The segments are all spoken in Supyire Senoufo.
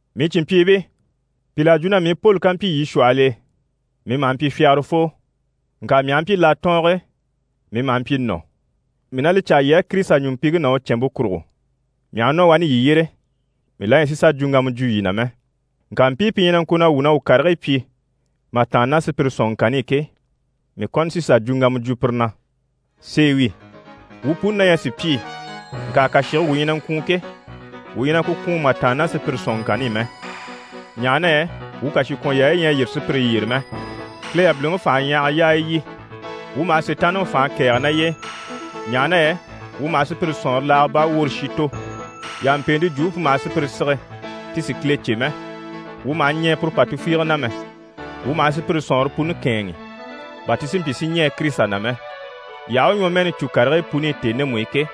Mii cìnmpyiibii, pìl'à jwo na mii Poli ká mpyi yii shwɔhɔl'e, mii maha mpyi fyagarafoo, ŋka mii aha mpyi latɔɔnge e, mii maha mpyi nɔ̀. Mii na li caa yii á Kirisita ɲùmpiŋke ná u cɛ̀nmpe kurugo, mii aha nɔ wani yii yyére, mii la ɲyɛ sì sà jwuŋgama jwo yii na mɛ. Ŋka mpii pi ɲyɛ na ŋko na wuu na wuu karigii pyi mà tàanna ná sùpyire sɔ̀nŋɔŋkanni i ke, mii kɔni sí n‑sà jwuŋgama jwo pire na. Sèe wi, wuu puni na ɲyɛ sùpyii, ŋka kàshige wuu ɲyɛ na ŋkwùun ke, wuu ɲyɛ na ku kwùun mà tàanna ná sùpyire sɔ̀nŋɔŋkanni i mɛ. Ɲaha na yɛ wuu kàshikwɔnyaayi ɲyɛ a yîri sùpyire yyére mɛ, Kile yabiliŋi fanhaɲyahaga yaaya yi. Wuu maha Sitaanniŋi fànhe kɛ̀ɛge ná y'e, ɲaha na yɛ wuu maha sùpyire sɔ̀nŋɔre laaga baa woore shi tò. Yampeente jwumpe pu maha sùpyire sige ti si Kile cè mɛ, wuu maha ɲɛɛ puru pà tufiige na mɛ. Wuu maha sùpyire sɔ̀nŋɔre puni kɛ̂ɛnŋi, bà ti si mpyi si ɲɛɛ Kirisita na mɛ. Yii aha u ɲwɔmɛɛni cû karigii puni i tèni ndemu i ke,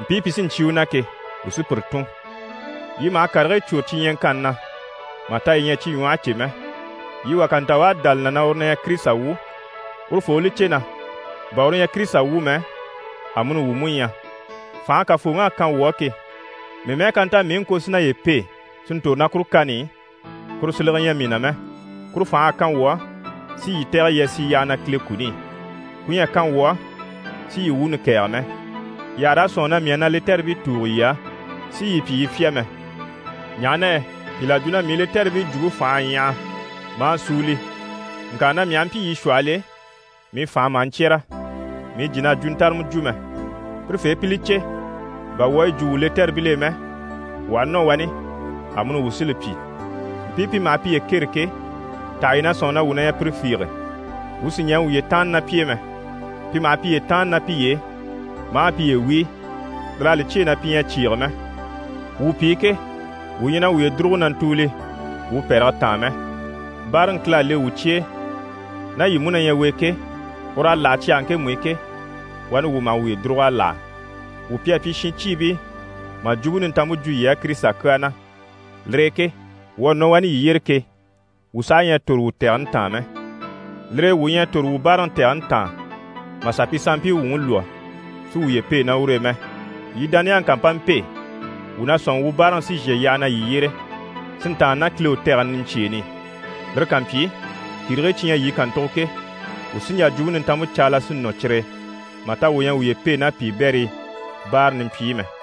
mpii pi sí n‑cyé u na ke, wuu sí pire tùn. Yii maha karigii cwôre cyi ɲyaŋkanni na, mà ta yii ɲyɛ a cyi ɲwɔhe cè mɛ. Yii wà ká nta u à dá li na na uru na ɲyɛ Kirisita wu, urufoo u li cè na bà uru ɲyɛ Kirisita wu mɛ, amuni wuu mú ɲyɛ. Fànhe Kafooŋi à kan wuu á ke, mii mɛ́ɛ ká nta mii i ŋko si naye pêe si ntòro ná kuru kani i, kuru silege ɲyɛ mii na mɛ. Kuru fành'à kan wuu á, si yii tɛ̀gɛ yii a sì yyaha na Kile kuni i, ku ɲyɛ a kan wuu á si yii wuuni kɛ̀ɛge mɛ. Yii àha raa sɔ̂nŋi na mii à na lɛtɛribii tùugo yii á si yii pyi yii fyá mɛ. Ɲaha na yɛ pìl'à jwo na mii lɛtɛribii jwumpe fành'à ɲyaha maa súuli, ŋka na mii aha mpyi yii shwɔhɔl'e, mii fànhe maha ɲcyɛ́rɛ, mii jìn'à jwuntarama jwo mɛ. Pirefee pi li cè, bà wuu à yi jwo wuu lɛtɛribil'e mɛ, wuu aha nɔ wani, amuni wuu sí li pyi. Mpii pi maha piye kêre ke, taha yii na sɔ̂nŋi na wuu ɲyɛ pire fiige? Wuu sì ɲɛɛ wuye tàanna ná pi e mɛ! Pi maha piye tàanni ná piye e, maa piye wíi. Lir'à li cyêe na pi ɲyɛ a cyìige mɛ. Wuu pi ke, wuu ɲyɛ na wuye dùruge na ntùuli wuu pɛ̀rɛge taan mɛ. Báaraŋi Kile à le wuu cye e, ná yii mú na ɲyɛ u e ke, ur'à láha cyage ŋkemu i ke, wani wuu maha wuye dùrug'à láha. Wuu pi à pyi shincyiibii mà Jwumpe Nintanmpe jwo yii á Kirisita kyaa na. Lire e ke wuu à nɔ wani yii yyére ke, wuu saha ɲyɛ a tòro wuu tɛgɛni taan mɛ. Lire e wuu ɲyɛ a tòro wuu báaraŋi tɛgɛni taan, mà sà pi sanmpii wuŋi lwɔ́, si wuye pêe ná ur'e mɛ. Yii dániyaŋi ká mpa mpêe, wuu na sɔ̂nŋi wuu báaraŋi sí n‑shà yyaha na yii yyére, si ntàanna ná Kile u tɛgɛni niɲcyeeni i. Lire ká mpyi, kìrigii cyi ɲyɛ yii kàntugo ke, wuu sí n‑jà Jwumpe Nintanmpe caala si nɔ cyire e, mà ta wuu ɲyɛ a wuye pêe ná piibɛrii báara nimpyi i mɛ.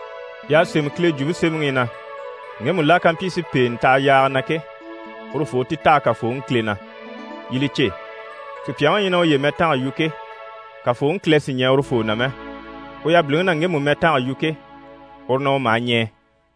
Y'à sémɛ Kile Jwumpe Semɛŋi i na: «Ŋgemu la ká mpyi si pèenɛ taha yaaga na ke, urufoo u ti taha Kafooŋi Kile na.» Yii li cè, sùpyaŋi u ɲyɛ na uye mɛtanga yu ke, Kafooŋi Kile sì ɲɛɛ urufoo na mɛ, u yabiliŋi na ŋgemu mɛtanga yu ke, uru na u maha ɲɛɛ.